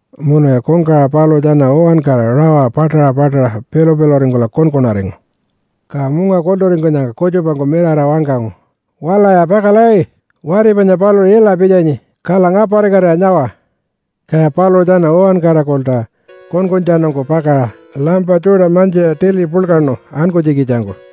Munuya kungkawaṟa paluṟu tjana uwankara rawa paṯaṟa paṯaṟa pilu-piluringkula kunkunaringu. Ka munga kulturingkunyangka kutjupangku mirara wangkangu, ‘Walaya pakala! Wati panya paluṟu ila pitjanyi, kala ngaparikatira nyawa!’ Kaya paluṟu tjana uwankarangkulta kunkuntjanungku pakaṟa lampa tjuṯa mantjiṟa tili puḻkaṉu ankunytjikitjangku.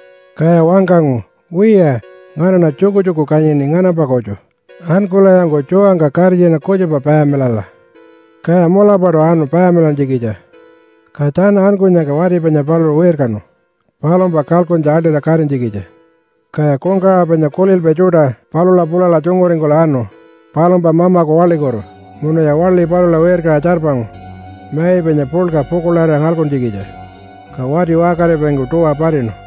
Kaya wangkangu, ‘Wiya, nganaṉa tjukutjuku kanyini nganampa kutju. Ankulayanku tjuwangka karitjina kutjupa payamilala!’ Kaya mulapaṯu anu payamilantjikitja. Ka tjana ankunyangka wati panya paluṟu wirkanu palumpa kalkuntja aḻṯira katinytjikitja. Kaya kungkawaṟa panya kulilpai tjuṯa palula pulala tjunguringkula anu palumpa mamaku waḻikutu munuya waḻi palula wirkaṟa tjarpangu mai panya puḻka pukuḻarira ngalkuntjikitja, ka wati waṟkaripaingku tuwa patinu.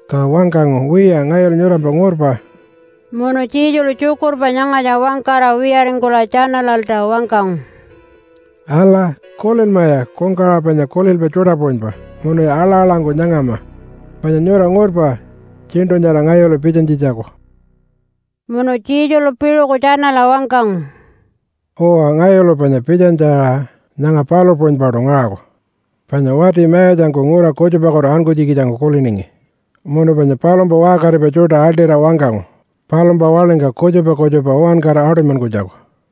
Ka wangkangu, ‘Wiya, ngayulu nyurampa ngurpa.’” Munu Jesulu tjukurpa nyangatja wangkara wiyaringkula tjanalalta wangkangu, “Ala! Kulinmaya kungkawaṟa panya kulilpai tjuṯa puṟunypa munuya aḻa-aḻangku nyangama! Panya nyura ngurpa tjiṉṯu nyara ngayulu pitjanytjitjaku.” Munu Jesulu piṟuku tjanala wangkangu, “Uwa, ngayulu panya pitjanytja aṟa nyanga palu puṟunypaṯu ngaṟaku. Panya wati mayatjangku ngura kutjupakutu ankunytjikitjangku kuliningi munu panya palumpa waṟkaripai tjuṯa aḻṯira wangkangu palumpa waḻingka kutjupa kutjupa uwankara aṯunymankunytjaku.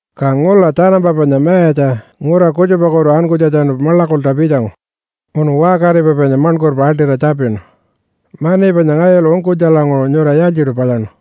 “Ka ngula tjanampa panya mayatja ngura kutjupakutu ankunytjatjanu maḻakulta pitjangu munu waṟkaripai panya maṉkurpa aḻṯira tjapinu, ‘Mani panya ngayulu ungkunytjalanguṟu nyura yaaltjiṯu palyaṉu?’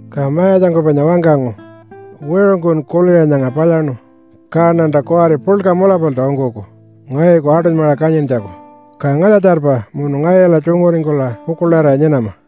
“Ka mayatjangku panya wangkangu, ‘Wiṟungkun kuliṟa nyanga palyaṉu, kaṉanta kuwari puḻka mulapalta ungkuku ngayuku aṯunymaṟa kanyintjaku. Ka ngalya-tjarpa, munu ngayula tjunguringkula pukuḻarira nyinama.’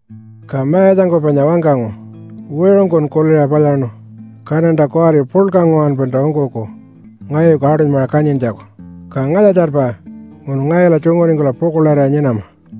“Ka mayatjangku panya wangkangu, ‘Wiṟungkun kuliṟa palyaṉu, kaṉanta kuwari puḻka nguwanpalta ungkuku ngayuku aṯunymaṟa kanyintjaku. Ka ngalya-tjarpa, munu ngayula tjunguringkula pukuḻarira nyinama.’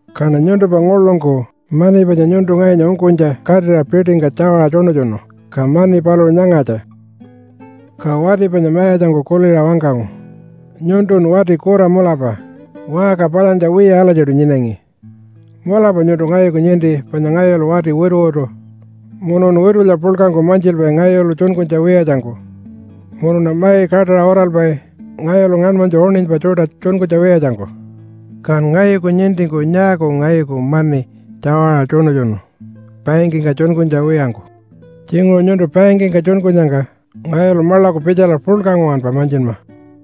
Kaṉa nyuntumpa nguḻungku mani panya nyuntu ngayunya ungkunytja katira piṯingka tjawaṟa tjuṉutjunu. Ka mani paluṟu nyangatja.’ “Ka wati panya mayatjangku kuliṟa wangkangu, ‘Nyuntun wati kura mulapa waṟka palyantja wiya alatjiṯu nyinangi. Mulapa nyuntu ngayuku ninti panya ngayulu wati wituwitu munuṉa witulya puḻkangku mantjilpai ngayulu tjunkunytja wiyatjangku, munuṉa mai kaṯaṟa uralpai ngayulu ngaṉmanytju uṉinypa tjuṯa tjunkunytja wiyatjangku. Kan ngayuku nintingku nyaaku ngayuku mani tjawaṟa tjuṉutjunu bankingka tjunkunytja wiyangku? Tjinguṟu nyuntu bankingka tjunkunyangka ngayulu maḻaku pitjala puḻka nguwanpa mantjinma.’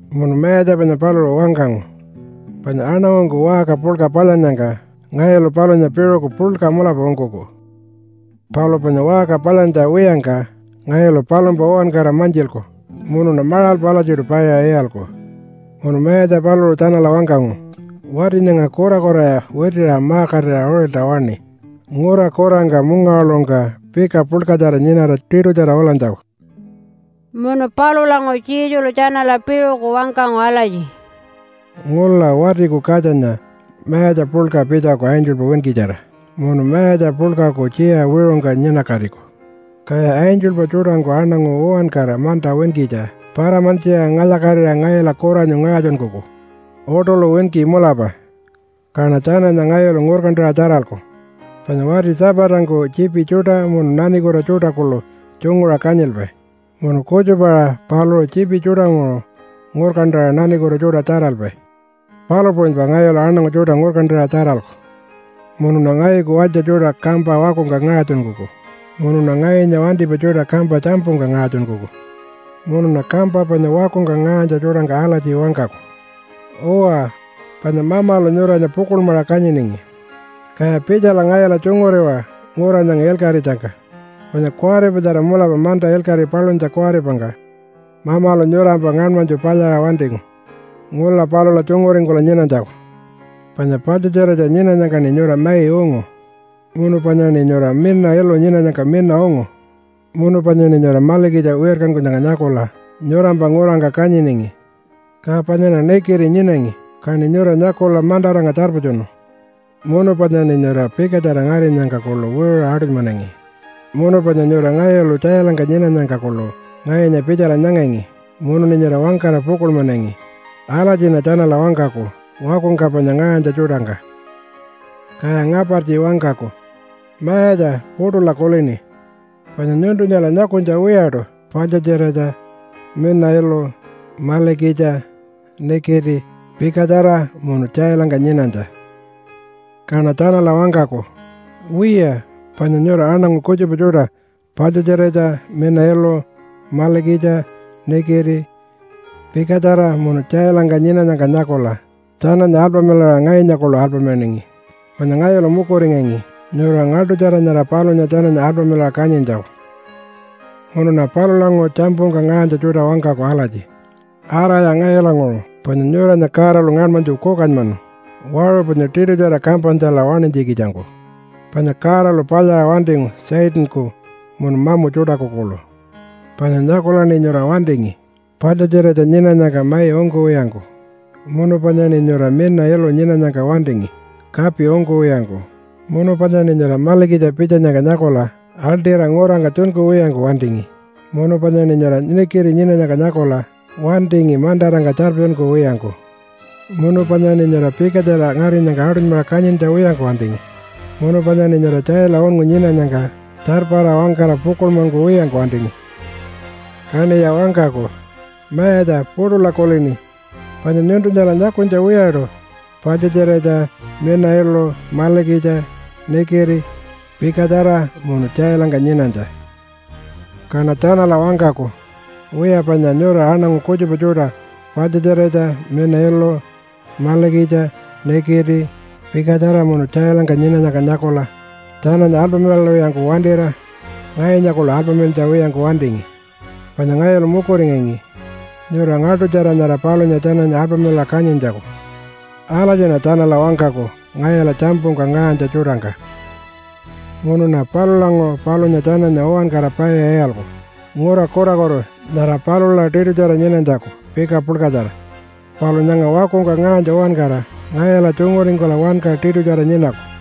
Munu mayatja panya paluṟu wangkangu, ‘Panya aṉangungku waṟka puḻka palyannyangka ngayulu palunya piṟuku puḻka mulapa ungkuku, palu panya waṟka palyantja wiyangka ngayulu palumpa uwankara mantjilku munuṉa maṟalpa alatjiṯu paiṟa iyalku.’ Munu mayatja paluṟu tjanala wangkangu, ‘Wati nyanga kurakuraya witiṟa ma-katira uṟilta waṉi ngura kurangka mungawaḻuṟungka pika puḻkatjara nyinara tiṯutjara ulanytjaku.’” Munu palulanguṟu Jesulu tjanala piṟuku wangkangu alatji, “Ngula Watiku Katjanya mayatja puḻka pitjaku angelpa winkitjara munu mayatja puḻkaku tjiya wiṟungka nyinakatiku. Kaya angelpa tjuṯangku aṉangu uwankara manta winkitja para-mantjiṟa ngalya-katira ngayula kuranyu ngaṟatjunkuku uṯuḻu winki mulapa. Kaṉa tjananya ngayulu ngurkantaṟa tjaralku, panya wati tjapatangku tjiipi tjuṯa munu nanikuta tjuṯa kuḻu tjunguṟa kanyilpai munu kutjupa-aṟa paluṟu tjiipi tjuṯanguṟu ngurkantaṟa nanikuta tjuṯa tjaralpai, palu puṟunypa ngayulu aṉangu tjuṯa ngurkantaṟa tjaralku. Munuṉa ngayuku walytja tjuṯa kampa wakungka ngaṟatjunkuku munuṉa ngayunya wantipai tjuṯa kampa tjampungka ngaṟatjunkuku. Munuṉa kampa panya wakungka ngaṟanytja tjuṯangka alatji wangkaku, ‘Uwa, panya Mamalu nyuranya pukuḻmaṟa kanyiningi, kaya pitjala ngayula tjunguriwa ngura nyanga ilkaṟitjangka. Panya kuwaripatjara mulapa manta ilkaṟi paluntja kuwaripangka Mamalu nyurampa ngaṉmanytju palyaṟa wantingu ngula palula tjunguringkula nyinanytjaku. Panya paḻtjatjiratja nyinanyangkaṉi nyura mai ungu, munu panyaṉi nyura mina ilu nyinanyangka mina ungu, munu panyaṉi nyura malikitja wirkankunyangka nyakula nyurampa ngurangka kanyiningi. Ka panyaṉa nikiti nyinangi, kaṉi nyura nyakula mantarangka tjarpatjunu. Munu panyaṉi nyura pikatjara ngarinyangka kuḻu wiṟuṟa aṯunymanangi. Munu panya nyura ngayulu tjailangka nyinanyangka kuḻu ngayunya pitjala nyangangi munuṉi nyura wangkara pukuḻmanangi.’ Alatjiṉa tjanala wangkaku wakungka panya ngaṟanytja tjuṯangka. “Kaya ngapartji wangkaku, ‘Mayatja, puṯula kulini. Panya nyuntunyala nyakunytja wiyaṯu paḻtjatjiratja, mina ilu, malikitja, nikiti, pikatjara munu tjailangka nyinanytja.’ “Kaṉa tjanala wangkaku, ‘Wiya, panya nyura aṉangu kutjupa tjuṯa paḻtjatjiratja, mina ilu, malikitja, nikiti, pikatjara munu tjailangka nyinanyangka nyakula tjananya alpamilaṟa ngayunya kuḻu alpamilaningi, panya ngayulu mukuringangi nyura ngaḻṯutjara nyara palunya tjananya alpamilaṟa kanyintjaku.’ “Munuṉa palulanguṟu tjampungka ngaṟanytja tjuṯa wangkaku alatji, ‘Araya ngayulanguṟu panya nyuranya Godalu ngaṉmanytju kukanymanu waṟu panya tiṯutjara kampanytjala waṉinytjikitjangku, panya Godalu palyaṟa wantingu Satanku munu mamu tjuṯaku kuḻu. Panya nyakulaṉi nyura wantingi paḻtjatjiratja nyinanyangka mai ungkuwiyangku, munu panyaṉi nyura mina ilu nyinanyangka wantingi kapi ungkuwiyangku, munu panyaṉi nyura malikitja pitjanyangka nyakula aḻṯira ngurangka tjunkuwiyangku wantingi, munu panyaṉi nyura nikiti nyinanyangka nyakula wantingi mantarangka tjarpatjunkuwiyangku, munu panyaṉi nyura pikatjara ngarinyangka aṯunymaṟa kanyintja wiyangku wantingi, munu panyaṉi nyura tjaila unngu nyinanyangka tjarpara wangkara pukuḻmankuwiyangku wantingi.’ “Kaṉiya wangkaku, ‘Mayatja, puṯula kulini. Panya nyuntunyala nyakunytja wiyaṯu paḻtjatjiratja, mina ilu, malikitja, nikiti, pikatjara munu tjailangka nyinanytja.’ “Kaṉa tjanala wangkaku, ‘Wiya, panya nyura aṉangu kutjupa tjuṯa paḻtjatjiratja, mina ilu, malikitja, nikiti, pikatjara munu tjailangka nyinanyangka nyakula tjananya alpamilalwiyangku wantira ngayunya kuḻu alpamilantja wiyangku wantingi, panya ngayulu mukuringangi nyura ngaḻṯutjara nyara palunya tjananya alpamilaṟa kanyintjaku.’ Alatjiṉa tjanala wangkaku ngayula tjampungka ngaṟanytja tjuṯangka. “Munuṉa palulanguṟu palunya tjananya uwankara paiṟa iyalku ngura kurakutu nyara palula tiṯutjara nyinanytjaku pika puḻkatjara. Palu nyanga wakungka ngaṟanytja uwankara ngayula tjunguringkula wanka tiṯutjara nyinaku.”